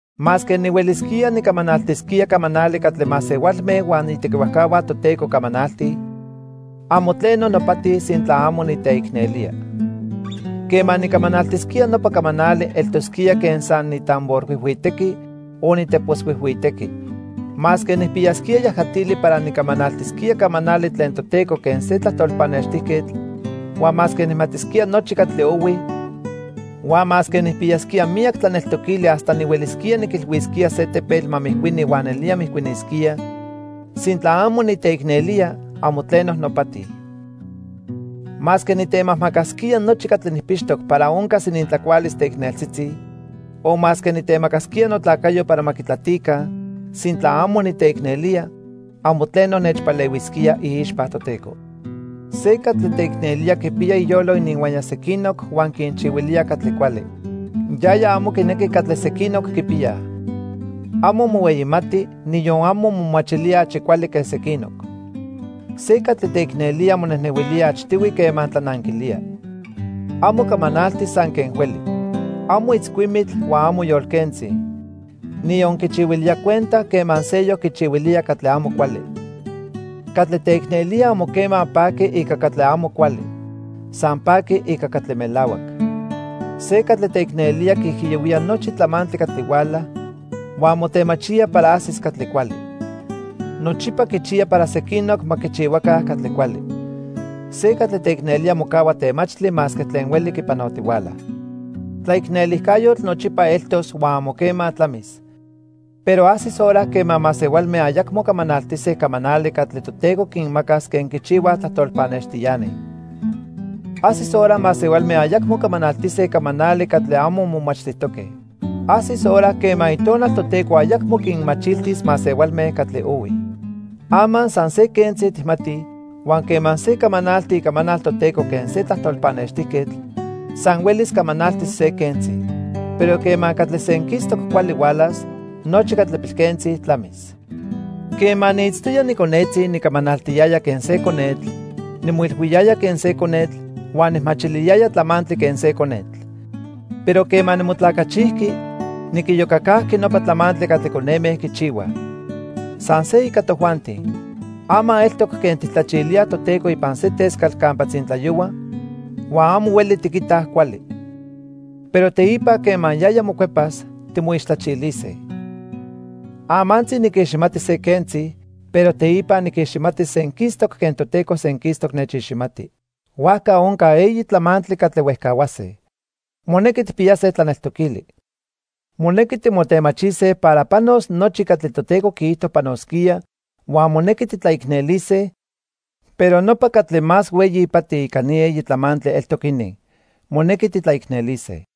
Masque nihuelisquía nicamanaltisquía camanali catli masehualme huan itequihuajcahua Toteco camanaltij, amo tleno nopati sintla amo niteicnelía. Quema nicamanaltisquía nopa camanali eltosquía quen san nitamborhuijhuitequi o niteposhuijhuitequi. Masque nijpiyasquía yajatili para nicamanaltisquía camanali tlen Toteco quen se tlajtol pannextijquetl, huan masque nijmatisquía nochi catli ohui huan masque nijpiyasquía miyac tlaneltoquili hasta nihuelisquía niquilhuisquía se tepetl ma mijcuini huan nelía mijcuinisquía, sintla amo niteicnelía, amo tleno nopati. Masque nitemajmacasquía nochi catli nijpixtoc para oncas inintlacualis teicneltzitzi, o masque nitemacasquía notlacayo para ma quitlatica, sintla amo niteicnelía, amo tleno nechpalehuisquía iixpa Toteco. Se catli teicnelía quipiya iyolo ininhuaya sequinoc huan quinchihuilía catli cuali. Yaya amo quinequi catli sequinoc quipiyaj. Amo mohueyimati, niyon amo momachilía achi cuali que sequinoc. Se catli teicnelía monejnehuilía achtihui quema tlananquilía. Amo camanalti san que hueli. Amo itzcuimitl huan amo yolquentzi. Niyon quichihuilía cuenta quema seyoc quichihuilía catli amo cuali. Catli teicnelía amo quema paqui ica catli amo cuali. San paqui ica catli melahuac. Se catli teicnelía quiijiyohuía nochi tlamantli catli huala, huan motemachía para ajsis catli cuali. Nochipa quichiya para sequinoc ma quichihuaca catli cuali. Se catli teicnelía mocahua temachtli masque tlen hueli quipanotihuala. Tlaicnelijcayotl nochipa eltos huan amo quema tlamis. Pero ajsis hora quema masehualme ayacmo camanaltise camanali catli Toteco quinmacas quen quichihuaj tlajtol pannextiani. Ajsis hora masehualme ayacmo camanaltise camanali catli amo momachtijtoque. Ajsis hora quema Itonal Toteco ayacmo quinmachiltis masehualme catli ohui. Ama san se quentzi tijmatij, huan quema se camanalti icamanal Toteco quen se tlajtol pannextijquetl, san huelis camanaltis se quentzi. Pero quema catli senquistoc cuali hualas, nochi catli pilquentzi tlamis. Quema niitztoya niconetzi nicamanaltiyaya quen se conetl, nimoilhuiyaya quen se conetl, huan nijmachiliyaya tlamantli quen se conetl. Pero quema nimotlacachijqui, niquiyocacajqui nopa tlamantli catli coneme quichihuaj. San se ica tojuanti. Ama eltoc quen tijtlachilíaj Toteco ipan se tescatl campa tzintlayohua huan amo hueli tiquitaj cuali. Pero teipa quema yaya mocuepas, timoixtlachilise. Amantzi niquiximati se quentzi, pero teipa niquiximatis senquistoc quen Toteco senquistoc nechiximati. Huajca onca eyi tlamantli catli huejcahuase. Monequi tijpiyase tlaneltoquili. Monequi timotemachise para panos nochi catli Toteco quiijto panosquía, huan monequi titlaicnelise, pero nopa catli más hueyi ipati ica ni eyi tlamantli eltoc inin, monequi titlaicnelise.